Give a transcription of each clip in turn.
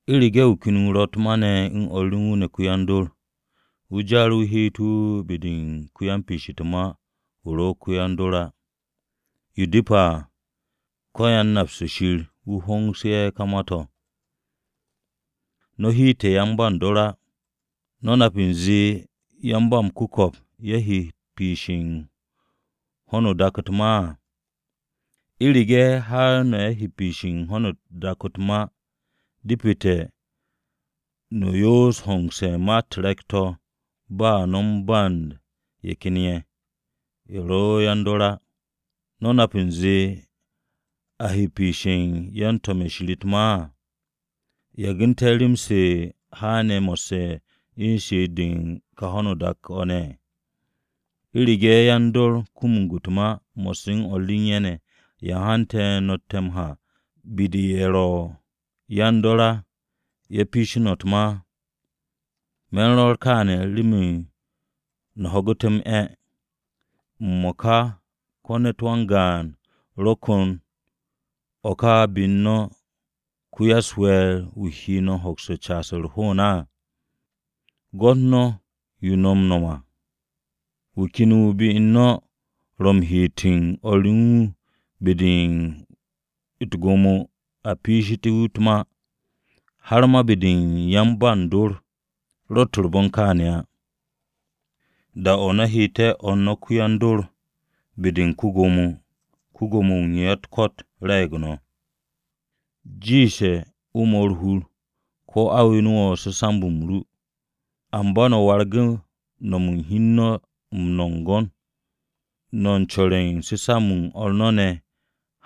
U̱rege̱ wu̱ ken wu̱ ro̱ u̱t-ma ne̱ u̱n o̱r u̱n wu̱ ne̱ ko-yan-dor, wu̱ jar wu̱ heet to̱ be-de u̱n ko-yan-piish u̱t-ma wu̱ ro̱ ko-yan-dor á. Yo depe̱ à, ko-yan-napse̱ Shir wu̱ hongsu̱ no̱ ka ma-to̱. No̱ heete̱ yan-ba u̱n dor á. ¿No̱ nap u̱nze yan-ba-m-ku̱ko̱p ye̱ he piishe̱ u̱n ho̱no o-dak u̱t-ma á? U̱rege̱ har no̱ ye̱ he piishe̱ u̱n ho̱no o-dak u̱t-ma, depete̱ no̱ yoos hongse̱ u̱n ma-u̱t re̱k-to̱ ba no̱ u̱n band ye̱ ken ye̱, ye̱ ro̱ yan-dor á. ¿No̱ nap u̱nze a he no̱ piishe̱ u̱n yan-to̱m-ye̱ Shir u̱t-ma á? ¿Yagu̱nte̱ rem-se haane̱ mo̱sse̱ u̱n she'et-de u̱n kà ho̱no dak-o̱ ne̱? ¿U̱rege̱ yan-dor kumug u̱t-ma mo̱sse̱ u̱n o̱r re u̱n ye̱ ne̱, ya hante̱ no̱tte̱ ha be-de ye̱ ro̱ yan-dor á ye̱ piishe̱ no̱ u̱t-ma? Me̱ u̱n rwo̱r to̱ kaane̱ remen no̱ ho̱gu̱te̱ m-'e̱. ¿M-mo̱ka ko̱ ne̱t wan-gaan wu̱ ro̱ ko̱n o̱ ká be u̱n no̱ ko-ya-u̱s-we̱e̱r wu̱ he no̱ hoks caas u̱r-hoon á? Gwo̱t no̱ yo no̱ m-no̱m à. Wu̱ ken wu̱ be-u̱r no̱ ro̱ m-heet u̱n o̱r re u̱n wu̱ be-de u̱t-gwo̱mo a piishté̱ wu̱ u̱t-ma. Har ma be-de u̱n yan-ba u̱n dor! Ro̱tt u̱r-bon kaane̱ á. Da-o̱ no̱ heete̱ o̱r no̱ ko-yan-dor be-de u̱n ko-gwo̱mo, ko-Gwo̱mo-wu̱ u̱n ya-u̱t-ko̱t re̱e̱g no̱. Jiishte̱ o 'mo u̱r-hur ko̱ a we̱n wo̱ su̱samb-m ru. Amba no̱ wargu̱ hi u̱n no̱ m-nongon, no̱ u̱n co̱re̱ u̱n su̱samb-m o̱r no̱ ne̱,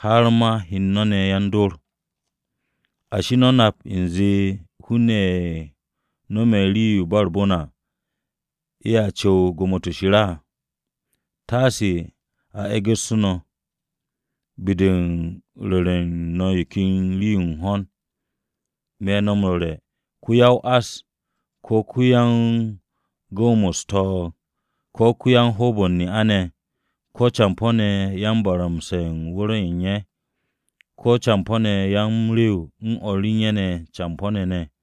har ma o̱r no̱ ne̱ yan-dor! ¿Ashi, no̱ nap u̱nze hun-ne̱ ye̱ no̱me̱ rii-yo u̱n ba u̱r-bon à, ye̱a cu̱w u̱n Gwo̱mo-to̱ Shir á? Taase a e̱gu̱ssu̱ no̱, be-de u̱n ru̱re̱ u̱n no̱ yo ken rii-yo u̱n hon. Me̱ no̱ m-ru̱re̱, ko-ya-o-ás, ko̱ ko-yan-gu̱w-mo̱ u̱s-to̱o̱g, ko̱ ko-yan-hoob-o̱ u̱n ne'a-ne̱, ko̱ campo̱-ne̱ yan-baramse̱ u̱n wu̱r-o̱ u̱n ye̱, ko̱ campo̱-ne̱ yan-m-rewe̱ u̱n o̱r u̱n ye̱ campo̱-ne̱ ne̱,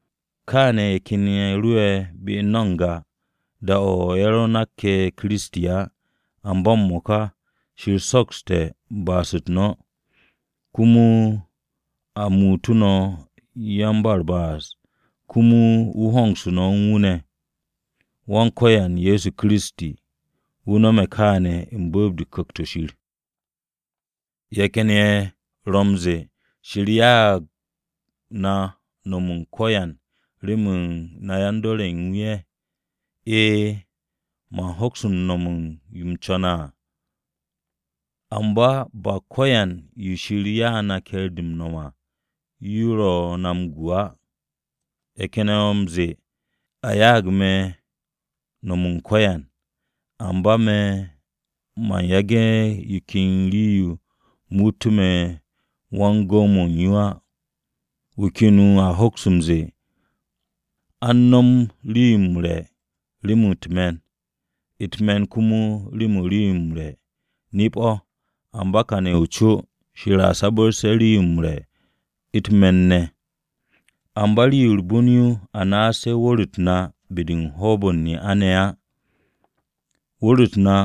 Kaane̱ ye̱ ken rowe̱ be u̱n no̱ n-ga, da-o̱ no̱ ro nakke̱ Kiristi á. Amba m-mo̱ka, Shir sokste̱ ba'as-u̱t no̱, komo a muutu̱ no̱ yan-ba-u̱r-ba'as komo wu̱ hongsu̱tu̱ no̱ u̱n wu̱ ne̱. Wan-Ko̱yan Ye̱so Kiristi, wu̱ nome̱ kaane̱ u̱n be̱e̱b-de u̱n Ku̱kt-o̱ Shir. Ye̱ ken ye̱ ro̱ m-ze̱e̱, “Shir ya'ag na nom u̱n ko̱yan remen na yan-dor ye̱ u̱n wu̱ ye̱.” E̱e̱, man hoks no̱m u̱n yo u̱m co̱ne̱ à, amba ba ko̱yan yo Shir ya'u̱ na ke̱e̱r-de m-no̱m à yo ro̱ na m-gu á. Ye̱ ken ye̱ ro̱ m-ze̱e̱, “A ya'ag me̱ nom u̱n ko̱yan,” amba me̱ man yage̱ yo ken rii-yo muut me̱ wan-gu̱w-mo̱ u̱n yo á. Wu̱ ken a hoks m-ze̱e̱, “A u̱n no̱m rii-yo m-re̱ remen u̱t-me̱n, u̱t-me̱n komo remen rii-yo m-re̱,” Nip-o̱, amba kane̱ u̱n co Shir a sabu̱rse̱ rii-yo m-re̱ u̱t-me̱n ne̱. Amba rii-yo u̱r-bon yo a naas wu̱r-u̱t na be-de u̱n hoob-o̱ u̱n ne'a-ne̱ á. Wu̱r-u̱t na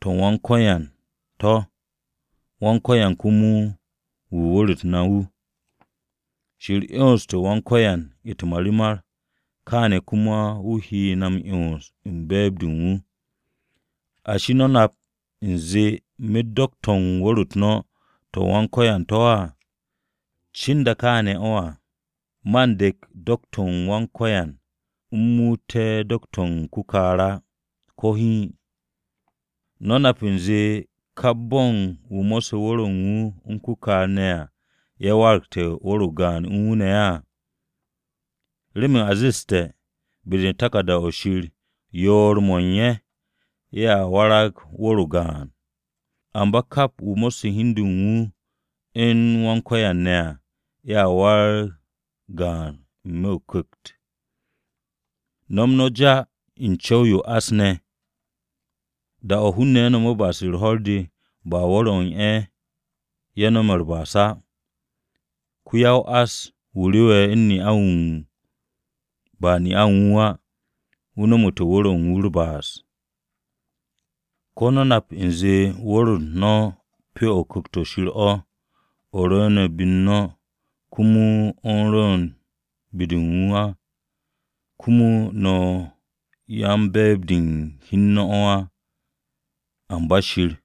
to̱ u̱n Wan-Ko̱yan to̱ Wan-Ko̱yan komo wu̱ u̱n wu̱r-u̱t na wu̱. Shir 'yonste̱ Wan-Ko̱yan u̱t-marimar, kaane̱ komo wu̱ he na m-'yons u̱n be̱e̱b-de u̱n wu̱. ¿Ashi, no̱ nap u̱nze myet do̱k-to̱ u̱n wu̱r-u̱t no̱ to̱ ma Kiristi to̱ á? Cinda kaane̱ o̱ à, man dek do̱k-u̱t Wan-Ko̱yan u̱m muutu̱ to̱ do̱k-to̱ u̱n ko-kaar á. Ko̱ hiin! ¿No̱ nap u̱nze kap bo̱n wu̱ mo̱sse̱ wu̱r-o̱ u̱n wu̱ u̱n ko-kaar ne̱ à, ye̱ waragte̱ wu̱r-o o-gaan u̱n wu̱ ne̱ á? Remen a zeste̱, be-de u̱n taku̱rda-o̱ Shir, “Yoor-mo̱ u̱n ye̱, ye̱ waragte̱ wu̱r-o o-gaan.” Amba kap wu̱ mo̱sse̱ hi u̱n du u̱n wu̱ u̱n Wan-Ko̱yan ne̱ à, ye̱a warag gaan n-me̱ o-ku̱kt. No̱m no̱ já u̱n co̱w-yo o-ás ne̱! Da-o̱ hun-ne̱ nome̱ ba'as-u̱r ho̱r-de, ba wu̱r-o̱ u̱n ye̱, ye̱ nome̱ u̱r-ba'as á. Ko-ya-o-ás wu̱ rewe̱ u̱n ne'a-ne̱ à ba ne'a u̱n wu̱ á, wu̱ nomote̱ wu̱r-o̱ u̱n wu̱ u̱r-ba'as. ¿Ko̱ no̱ nap u̱nze wu̱r-u̱t no̱ pyo-o̱ u̱n Ku̱kt-o̱ Shir o̱, o̱ ro̱ be u̱n no̱, komo o̱ rwu̱u̱ne̱ be-de wu̱ á? Komo no̱ ye̱ yan-be̱e̱b-de u̱n hi u̱n no̱ á, amba Shir.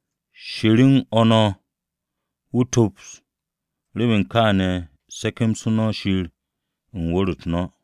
Shir u̱n o̱ no̱. Wu̱ tops, remen kaane̱ se̱ke̱msu̱ no̱ Shir u̱n wu̱r-u̱t no̱.